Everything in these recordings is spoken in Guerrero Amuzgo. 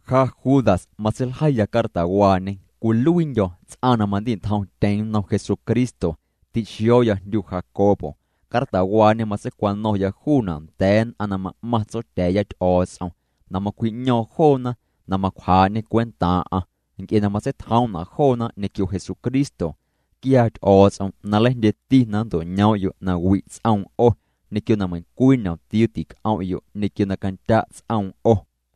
Ja Judas matseiljeiya cartawaañe. Cwiluiindyo̱ ts'aⁿ na mandi'ntjomtyeⁿ nnom Jesucristo. Ti'xio̱o̱ya jndyu Jacobo. Cartawaañe matseicwano̱ⁿya juuna' nda̱a̱ nn'aⁿ na ma'maⁿ Tsotya̱a̱ya Ty'o̱o̱ts'om na macwji'ño̱o̱ⁿ joona na macwjaa'ñê cwentaaⁿ'aⁿ, nc'e na matseitjoom'na' joona ñequio Jesucristo. Quiaa Ty'o̱o̱ts'om na nleijndyeti na nnto'ñoom'yo' na wi' ts'oom 'o, ñequio na meiⁿcwii ñomtiuu tic'om'yo' ñequio na candya' ts'oom 'o.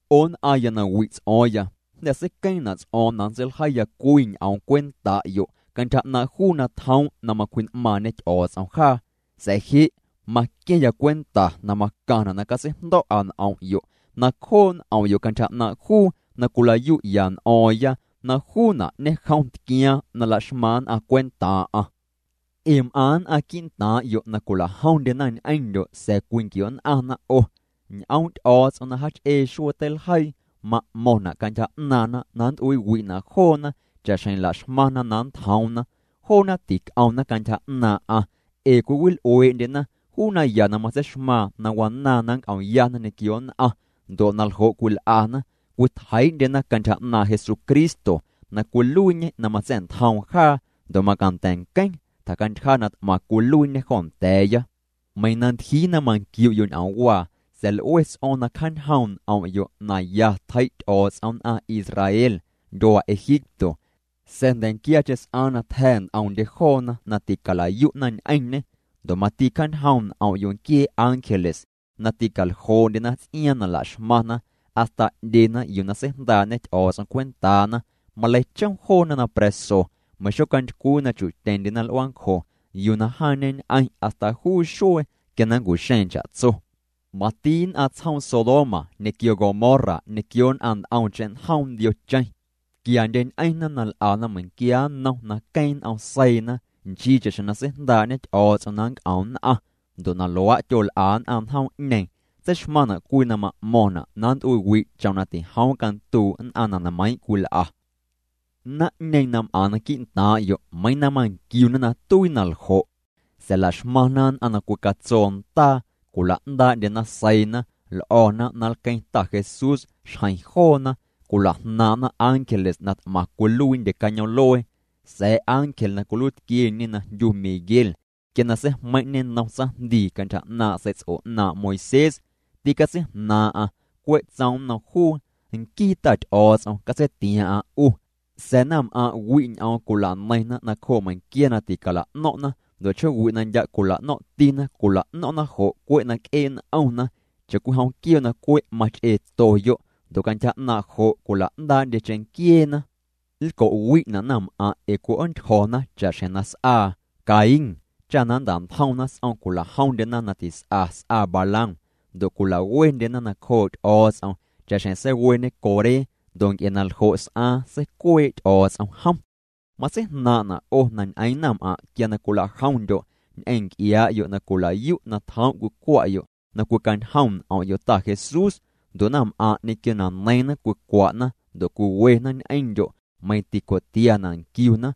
'O nn'aⁿya na wi' ts'o̱o̱ⁿya, jnda̱ seiqueeⁿna' ts'o̱o̱ⁿ na nntseiljeiya cwii ñ'oom cwenta'yo' cantyja 'naaⁿ' juu na tjoom' na macwji'n'maaⁿñe Ty'o̱o̱ts'om jaa, sa̱a̱ je' maqua̱ⁿya cwenta na macaⁿna' na catseijndo̱'a n'om'yo' na cjoo' n'om'yo' cantyja 'naaⁿ' juu na cwilayu'ya n'o̱o̱ⁿya na juuna' ñejom tquiaaⁿ na laxmaⁿ nn'aⁿ cwentaaⁿ'aⁿ. Ee m'aⁿ nn'aⁿ quii'ntaaⁿ'yo' na cwilajomndyena ñ'eⁿndyo' sa̱a̱ cwinquio'nn'aⁿna 'o. Ñ'oom' Ty'o̱o̱ts'om na jach'ee xuee teiljeii ma'mo̱ⁿna' cantyja 'naaⁿna na nnt'uiiwi'na' joona cha'xjeⁿ laxmaⁿna na nntjoomna. Joona tic'omna cantyja 'naaⁿ'aⁿ, ee cwiwil'uee'ndyena juu naya na matseixmaaⁿ na wanaaⁿ na nnc'omyana ñequio nn'aⁿ ndo' naljo' cwil'ana cwitjeii'ndyena cantyja 'naaⁿ' Jesucristo na cwiluiiñê na matsa̱'ntjoom jaa ndo' macanda̱ nqueⁿ tjacantyja na t'maⁿ cwiluiiñê jo nda̱a̱ya. Meiiⁿ na ntyjii na manquiu'yo' ñ'oomwaa sa̱a̱ l'ue ts'o̱o̱ⁿ na cjaañjoom' n'om'yo' na ya tjei' Ty'o̱o̱ts'om nn'aⁿ Israel ndyuaa Egipto sa̱a̱ jnda̱nquiacheⁿ s'aaⁿ na tja̱ nt'omndye joona na tîcala'yu'na ñ'eⁿñê. Ndo' mati cjaañjoom' n'om'yo' nquiee ángeles na ticaljoo'ndyena ts'iaaⁿ na laxmaⁿna, hasta 'ndyena yuu na seijndaa'ñe Ty'o̱o̱ts'om cwentaana, maleichom joona na pra̱so meiⁿ xocantycwii na chu'tyeⁿndyena l'uaancjo yuu na jaaⁿñeñ'eⁿ hasta juu xuee quia na nncu'xeeⁿ cha'tso. Mati nn'aⁿ tsjoom Sodoma ñequio Gomorra ñequio nn'aⁿ nt'omcheⁿ njoom ndiocheⁿ, tquiandyeñ'eⁿna na l'ana meiⁿquia nnom na queeⁿ n'om seiina nchii cha'xjeⁿ na seijndaa'ñe Ty'o̱o̱ts'om na nnc'om nn'aⁿ, ndo' na luaa' tyol'a nn'aⁿ njoom'ñeeⁿ tseixmaⁿna' cwii na ma'mo̱ⁿna' na nnt'uiiwi' chom na tijoom canduu' nn'aⁿ na nmeiiⁿ' cwil'a. Naⁿ'ñeeⁿ na m'aⁿna quii'ntaaⁿ'yo' meiiⁿ na manquiuna na tuii na ljo', sa̱a̱ laxmaⁿna nn'aⁿ na cwicatsoona ndaa, cwila'ndaa'ndyena seiina, l'o̱na na nlqueⁿ Ta Jesús xjeⁿ joona, cwila'jnaaⁿ'na ángeles na t'maⁿ cwiluiindye cañoom'luee. Sa̱a̱ ángel na cwiluiitquieñe na jndyu Miguel quia na seijmeiⁿ'ñê nnom tsaⁿjndii cantyja 'naaⁿ' sei'ts'o 'naaⁿ' Moisés, tîcatseijnaaⁿ'aⁿ cwe' tsoom nnom juu: “Nquii Ta Ty'o̱o̱ts'om catseitiaaⁿ'aⁿ 'u.” Sa̱a̱ naⁿm'aⁿ' wi' ñ'oom cwila'neiⁿna nacjoo' meiⁿnquia na ticala'no̱ⁿ'na, ndo' chjoowi' na ndya' cwila'no̱ⁿ'tina, cwila'no̱ⁿ'na jo' cwe' na c'ee' n'omna, cha'cwijom quioo' na cwe' mach'eetoyo'. Ndo' cantyja 'naaⁿ jo' cwila'ndaa'ndye cheⁿnquieena. Nlco'wi'na' naⁿm'aⁿ' ee cwi'oontyjo̱na cha'xjeⁿ na s'aa Caín. Cha na nnta'ntjomna s'om cwila'jomndyena na tis'a s'aa Balaam ndo' cwilawendyena nacjoo' Ty'o̱o̱ts'om cha'xjeⁿ seiweñe Coré ndo' nc'e na ljo' s'aaⁿ seicuee' Ty'o̱o̱ts'om jom. Matseijnaaⁿ'na' 'o na ñ'eeⁿ naⁿm'aⁿ' quia na cwilajomndyo' ñ'eⁿ nc'iaa'yo' na cwilayu' na tjoom' cwicwa'yo' na cwicañjom n'om'yo' Ta Jesús ndo' naⁿm'aⁿ' ñequio na neiiⁿna cwicwa'na ndo' cwiwena ñ'eⁿndyo' meiⁿ tico'tiana' nquiuna.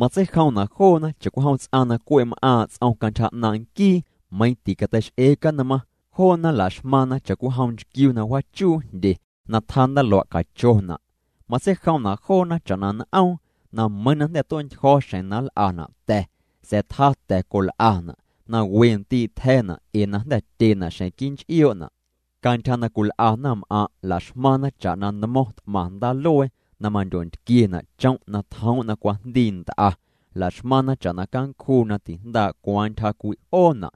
Matseijomna' joona cha'cwijom ts'aⁿ cwe' m'aaⁿ' ts'om cantyja 'naaⁿ' nquii meiⁿ ticateix'ee canmaⁿ. Joona laxmaⁿna cha'cwijom nchquiu na wjaachuu jndye na tjaa ndaluaa' cachona'. Matseijomna' joona cha'na n'oom na meiiⁿ na jnda̱ tue'ntyjo̱ xjeⁿ na nl'ana' ta̱, sa̱a̱ tjaa ta̱ col'ana', na we ndii' tja̱na' ee na jnda̱ tyena' xeⁿ quii' nch'ioona'. Cantyja na cwil'a naⁿm'aⁿ' la'xmaⁿna cha'na nmo̱ⁿ t'maⁿ ndaaluee na mandyontquiena' chom' na tjoom' na cwajndii nt'a, la'xmaⁿna cha'na cancjuu na tijndaa' cwaaⁿ ntyja cwi'oona'.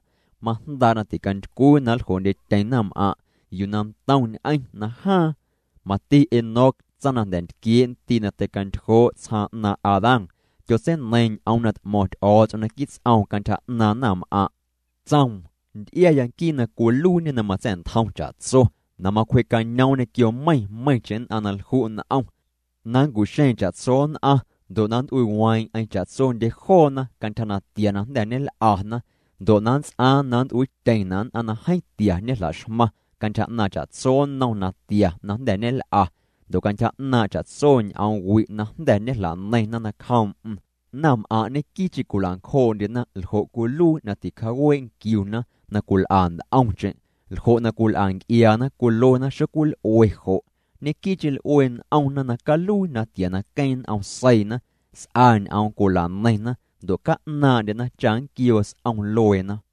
Majndaa' na ticantycwii na nljoo'ndyetyeⁿ naⁿm'aⁿ' yuu na ntomñ'eⁿ najaaⁿ. Mati Enoc, tsaⁿ na jnda̱ ntquiee' ndii' na tei'cantyjoo' tsjaaⁿ 'naaⁿ' Adán, tyotseineiiⁿ ñ'oom na t'mo̱ⁿ Ty'o̱o̱ts'om naquii' ts'oom cantyja 'naaⁿ naⁿm'aⁿ'. Tsoom: “Nt'iaya nquii na cwiluiiñe na matsa̱'ntjom cha'tso na macwjee'cañoom ñequio meiⁿ meiⁿcheⁿ nn'aⁿ na lju' n'om, na nncu'xeeⁿ cha'tso nn'aⁿ ndo' na nnt'uiiweeⁿ'eⁿ cha'tsondye joona cantyja natia na jnda̱ ñel'ana ndo' na nnts'aaⁿ na nnt'uiityeⁿna' nn'aⁿ na jeeⁿ tia ñejla'xmaⁿ cantyja 'naaⁿ cha'tso nnom natia na jnda̱ ñel'a, ndo' cantyja 'naaⁿ' cha'tso ñ'oom wi' na jnda̱ ñejla'neiⁿna nacjoom'm.” Naⁿm'aⁿ' ñequii'cheⁿ cwilancjoo'ndyena ljo' cwiluii na ticjaawee' nquiuna na cwil'a nt'omcheⁿ, ljo' na cwil'a nc'iaana cwiluena xocwil'ue jo'. Ñequii'cheⁿ l'ue n'omna na caluii natia na queeⁿ n'om seiina. S'a ñ'oom cwilaneiⁿna ndo' ca'naaⁿ'ndyena cha nnquioo s'om lueena.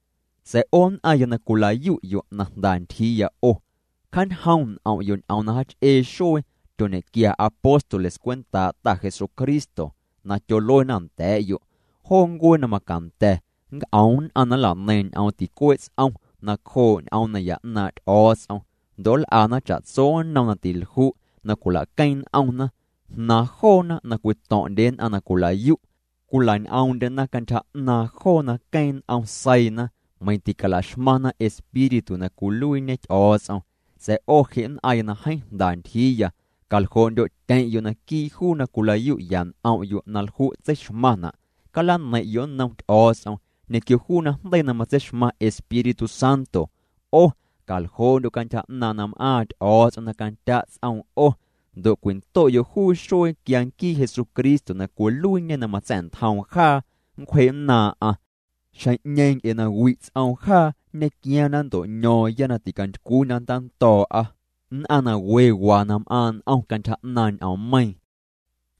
Sa̱a̱ 'o nn'aⁿya na cwila'yu' na jnda ntyjiiya 'o, cjaanjoom' n'om'yo' ñ'oom na jaach'ee xuee tyoñequia apóstoles cwentaa' Ta Jesucristo, na tyoluena nda̱a̱'yo': “Joo ncuee na macanda̱ nnc'om nn'aⁿ na nla'neiⁿ ñ'oom ticuee' ts'om nacjoo' ñ'oom naya 'naaⁿ' Ty'o̱o̱ts'om. Ndo' nl'ana cha'tso nnom na tilju' na cwila'queeⁿ n'omna.” Jnaaⁿ joona na cwito̱ⁿ'ndye nn'aⁿ na cwila'yu'. Cwila'ñ'oom'ndyena cantyja 'naaⁿ joo na queeⁿ n'om seiina, meiⁿ ticalaxmaⁿna Espíritu na cwiluiiñe Ty'o̱o̱ts'om. Sa̱a̱ 'o je' nn'aⁿya na jeeⁿ jnda ntyjiiya, caljoo'ndyo'tyeⁿ'yo' naquii' juu na cwila'yu'ya n'om'yo' na lju' tseixmaⁿna'. Calaneiⁿ'yo' nnom Ty'o̱o̱ts'om ñequio juu najndeii na matseixmaⁿ Espíritu Santo. 'O caljoo'ndyo' cantyja na m'aaⁿ Ty'o̱o̱ts'om na candya' ts'oom 'o ndo' cwindo'yo' juu xuee quia nquii Jesucristo na cwiluiiñê na matsa̱'ntjoom jaa nncwjee'nnaaⁿ'aⁿ, xjeⁿ'ñeeⁿ nc'e na wi' ts'oom jaa nñequiaaⁿ na nnto'ño̱o̱ⁿya na ticantycwii na nntando̱o̱'a. Nn'aⁿ na we waa na m'aaⁿ' n'om cantyja 'naaⁿ ñ'oommeiiⁿ,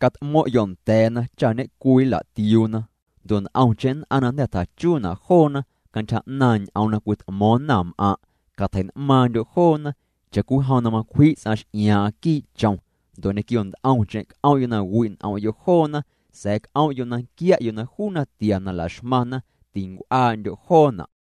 cat'mo̱ⁿ'yo' nda̱a̱na cha ñecwii nla'tiuuna. Ndo' nt'omcheⁿ nn'aⁿ na jnda̱ tjachuuna' joona cantyja 'naaⁿ' ñ'oom na cwit'mo̱o̱ⁿ naⁿm'aⁿ', catjei'n'maaⁿndyo' joona' cha'cwijom na macwji' ts'aⁿ x'iaaⁿ'aⁿ quii' chom. Ndo' ñequio nt'omcheⁿ c'om'yo' na wi' n'om'yo' joona sa̱a̱ c'om'yo' na nquia'yo' na juu natia na laxmaⁿna tincw'uaa'ndyo' joona'.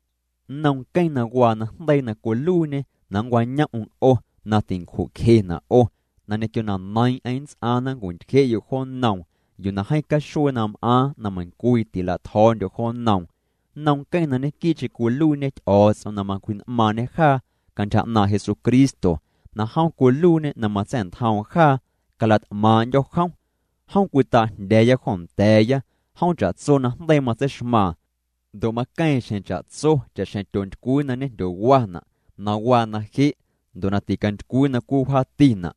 Nnom Nqueⁿ na waa najndeii na cwiluiiñê na nncwañom'm 'o na tincju'cjena' 'o na ñequio na neiiⁿ'eⁿ nnts'aaⁿ na nncwintyje'yo' jo nnoom yuu na jeeⁿ caxuee na m'aaⁿ na meiⁿcwii tila'tjo̱o̱ndyo' jo nnoom, nnom Nqueⁿ na ñequii'cheⁿ cwiluiiñê Ty'o̱o̱ts'om na macwji'n'maaⁿñê jaa cantyja 'naaⁿ' Jesucristo na jom cwiluiiñê na matsa̱'ntjoom jaa cala't'maaⁿ'ndyo̱ jom, jom cwitaa'jndya̱a̱ya jo nda̱a̱ya, jom cha'tso najndeii matseixmaaⁿ, ndo' na maqueeⁿ xjeⁿ cha'tso, cha'xjeⁿ tyoontycwii na ñejndyowana', na waa na je', ndo' na ticantycwii na cwiwjaatina'.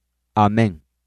Amén.